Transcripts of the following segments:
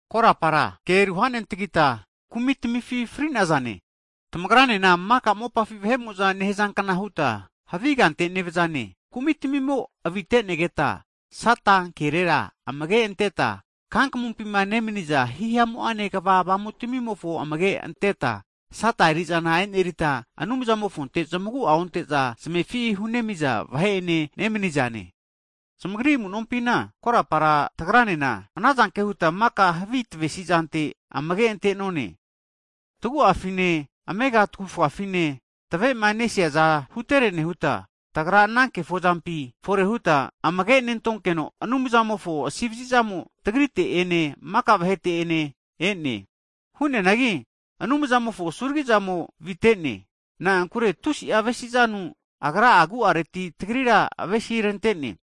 Korapara ke ruhanentagita, kumitmifi fri'nazane. Tamagranena maka mopafi vahe'mo'za nehazankna huta havi kante nevzane, kumi'tmimo avite'negeta, Sata kerera amage anteta, kankamumpi nemniza hihamu'ane kva avamutamimofo amage' anteta, Sata eri'zana enerita Anumzamofonte zamagu'a onte'za zamefi hunemi'za vahe'ene nemanizane. Zamagri amu'nompina korapara tagranena anazanke huta maka havi tvesi'zante amage ante'none, tagu'afine amega tavufafine tave'manesiaza hutere nehuta, tagra ana kefozampi fore huta amage' nentonkeno, Anumzamofo asi vazi'zamo tagrite ene maka vahete ene e'ne. Hu'neanagi Anumzamofo asuragi'zamo vite'ne, na'ankure tusi'a avesi'zanu Agra agu'areti tagrira avesi rante'ne.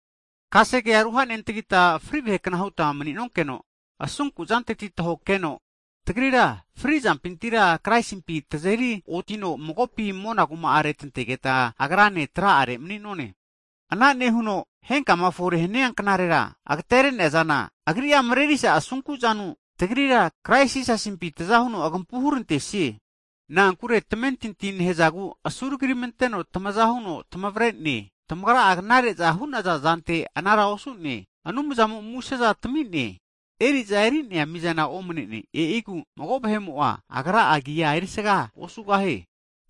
Kasege'a ruha'nentagita fri vahe kna huta mani'nonkeno, asunku'zanteti tahokeno, tagrira fri'zampitira, Kraisimpi tazeri otino magopi mona kuma'are tantegeta, Agrane kini tra'are mani'none, ana nehuno henkama fore hania knarera, agtere'nea zana Agri'a mrerisa asunku'zanu tagrira Kraisi Jisasimpi tza huno agampu hurantesie. Na'ankure tamentinti nehzagu asuntgiramanteno tamaza huno tamavre'ne. Tamagra'a knare'za hu'nanaza zante anara osu'neanki Anumzamo museza (gift) tami'ne. Eri'za eri'nea mizana omnene, e'igu mago vahe'mo'a, agra'a agi erisaga osugahie.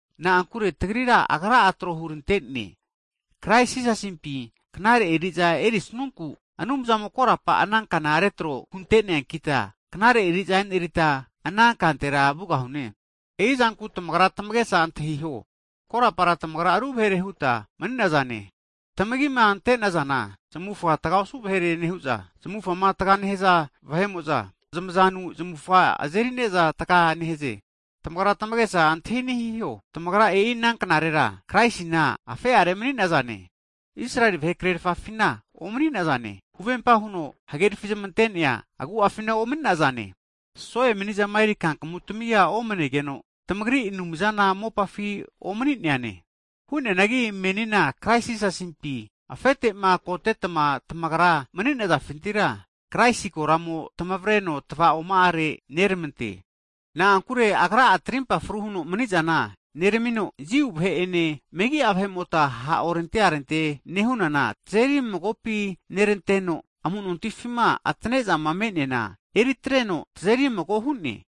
Na'ankure tagrira, Agra'a tro hurante'ne, Krais Jisasimpi knare eri'za erisnunku, Anumzamo korapa ana kana retro hunte'neankita, knare eri'za enerita ana kantera vugahune. E'i zanku tamagra tamagesa antahiho, korapara tamagra megi'a vahere huta mani'nazane (Gentiles), tamagima ante'nazana, zamufa tga osu vahere nehu'za, zamufama tga nehaza vahe'mo'za, (Jiu) e'i zamazanu zamufa azeri'ne'za tga nehaze. Tamagra tamagesa antahi ani hiho, tamagra e'i ana knarera Kraisina afe'are mani'nazane, Israeli vahe krerafane omani'nazane, huvempa huno huhagerafi zamante'nea agu'afina omani'nazane, so'e mani'zama eri kankamu tamia omanegeno, tamagri Anumzana mopafina omani'neane. Hu'neanagi, menina Krais Jisasimpi afete'ma kotetma tamagra mani'nazafintira, Kraisi koramo tamavreno tva'oma'are nermante. Na'ankure Agra'a tarimpa fru huno mni'zana (peace) neramino, Jiu vahe ene megi'a vahe'mota ha' orente arente nehunana tazeri magopi neranteno, amu'nontifima atane'zama me'neana, eritreno tazeri mago hu'ne.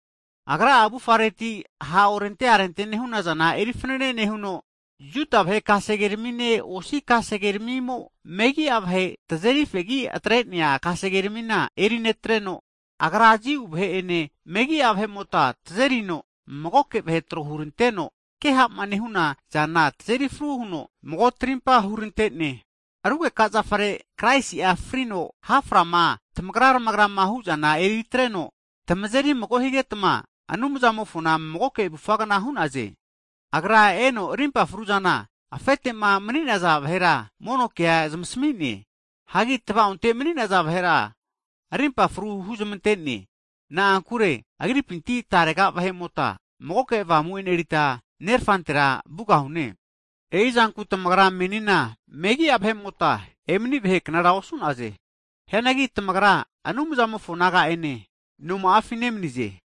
Agra'a avufareti ha' orente arente nehu'nazana eri fnane nehuno, Jiu vahe kasege ramine, osi kasege ramimo megi'a vahe (Gentiles) tazeri fegi atre'nea kasege ramina eri netreno, Agra'a Jiu vahene megi'a vahemota tazerino magoke vahe tro huneranteno, ke ha'ma nehuna zana tazeri fru huno mago tarimpa hurante'ne. Rugeka zafare Kraisi'a frino ha' frama tamagra'rmagra hu'zana eritreno, tamazeri mago higetma, Anumzamofona magoke avufagna hu'naze. Agra eno rimpa fruzana afete'ma mani'naza vahera mono ke huzmasmi'ne, hagi tva'onte mani'naza vahera arimpa fru huzmante'ne. Na'ankure Agripinti tarega vahe'mota, magoke Avamu e'nerita, Nerfantera vugahune. E'i zanku tamagra menina megi'a vahe'mota, emani vahe knara osu'naze. Hianagi tamagra Anumzamofo naga'ene noma'afi nemanize.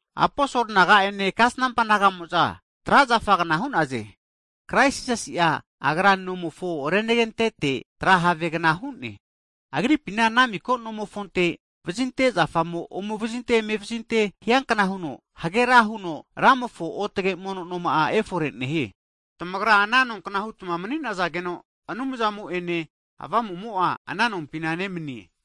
Aposol naga'ene kasnampa naga'mo'za, tra' zafagna hu'naze. Krais Jisasi'a Agra nomofo renagentete tra havegna hu'ne. Agripi ana miko nomofonte, vazinte zafamo ome vazinte eme vazinte hiankna huno hagera ra huno, Ramofo otage mono noma'a efore nehie. Tamagra ana nonkna hutma mani'nazageno, Anumzamo'ene Avamu'amo'a ana nompina mani'ne.